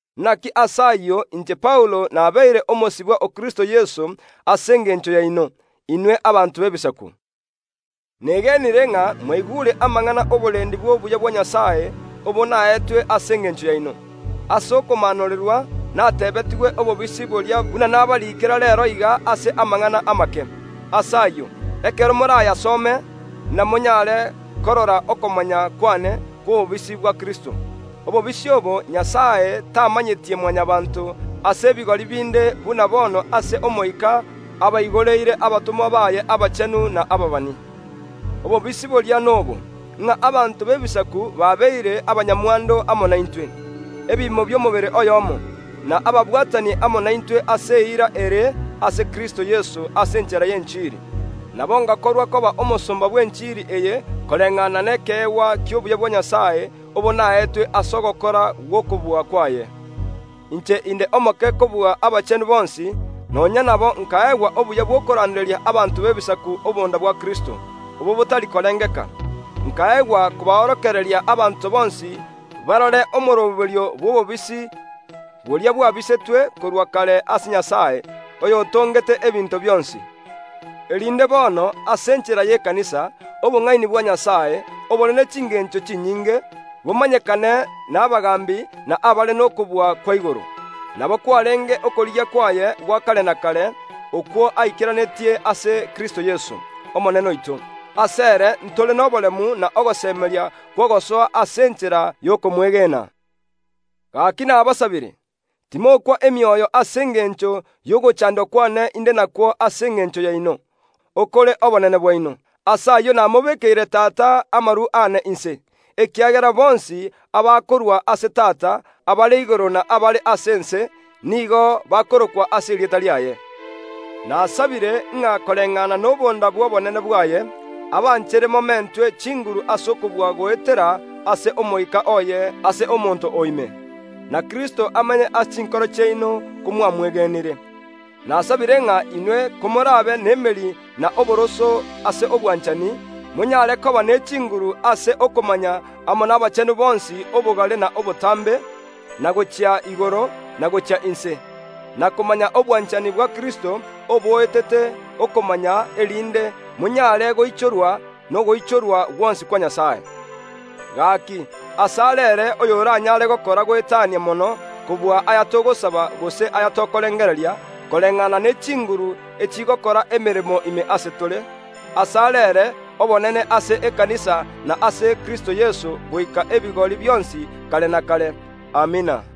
Inaki ase ayio inche Paulo nabeire omosibwa o Kristo Yeso ase engencho yaino, inwe abanto b’Ebisaku. Ase ekeene mwaigure amang’ana y’oborendi bw’obuya bwa Nyasae, obo naetwe ase engencho yaino. Ase okomaanorerwa nateebetigwe obobisi boria buna nabariikera reero iga ase amang’ana amake. Ase ayio, ekero morayasome, inamonyaare korora okomanya kw’ane kw’obobisi bwa Kristo. Obobisi obo Nyasae tamanyetie Mwanyabaanto ase ebigori binde buna bono ase Omoika abaigoreire abatomwa baye abachenu na ababani. Obobisi boria nobo, ng’a abanto b’Ebisaku babeire abanyamwando amo naintwe, ebiimo bi’omobere oyomo, na ababwatani amo naintwe ase eira ere ase Kristo Yeso ase enchera y’enchiri. Nabo ’ngakorwa koba omosomba bw’enchiri eye koreng’ana nekeegwa ki’obuya bwa Nyasae obo naetwe ase ogokora gw’okobua kwaye. Inche inde omoke kobua abachenu bonsi; nonya nabo ’nkaegwa obuya bw’okoranderia abanto b’Ebisaku obonda bwa Kristo, obo botari korengeka. Nkaegwa kobaorokereria abanto bonsi barore omooroberio bw’obobisi boria bwabisetwe korwa kare ase Nyasae, oyotongete ebinto bionsi; erinde bono, ase enchera y’ekanisa, obong’aini bwa Nyasae, obore ne chingeencho chinyinge, bomanyekane n’abagaambi na abare nokobua kwa igoro. Nabo kwareenge okorigia kwaye gwa kare na kare, okwo aikeranetie ase Kristo Yeso, Omonene oito. Asere ntore noboremu na ogosemeria kw’ogosoa ase enchera y’okomwegena. Gaki nabasabire, timokwa emioyo ase engencho y’ogochaandwa kw’ane inde nakwo ase engencho yaino, okore obonene bwaino. Ase ayio namobekeire amaru aane inse Tata, ekiagera bonsi abakorwa ase Tata, abare igoro na abare ase ense, nigo bakorokwa ase erieta riaye. Nasabire ng’a koreng’ana nobonda bw’obonene bwaye, abanchere momentwe chinguru ase okobua goeteera ase Omoika oye ase omonto o ime; na Kristo amenye ase chinkoro chiaino komwamwegenire. Nasabire ng’a inwe komor’abe n’emeri na oboroso ase obwanchani, monyaare koba ne chinguru ase okomanya amo nabachenu bonsi obogare na obotambe, na gochia igoro, na gochia inse, na komanya obwanchani bwa Kristo oboetete okomanya, erinde monyaare goichorigwa ogoichorwa gwonsi kwa Nyasae. Gaki, ase are ere oyoranyaare gokora goetania mono kobua aya togosaba gose aya tokorengereria, koreng’ana ne chinguru chigokora emeremo ime ase tore, ase are ere obonene ase ekanisa na ase Kristo Yeso goika ebigori bionsi kare na kare. Amina.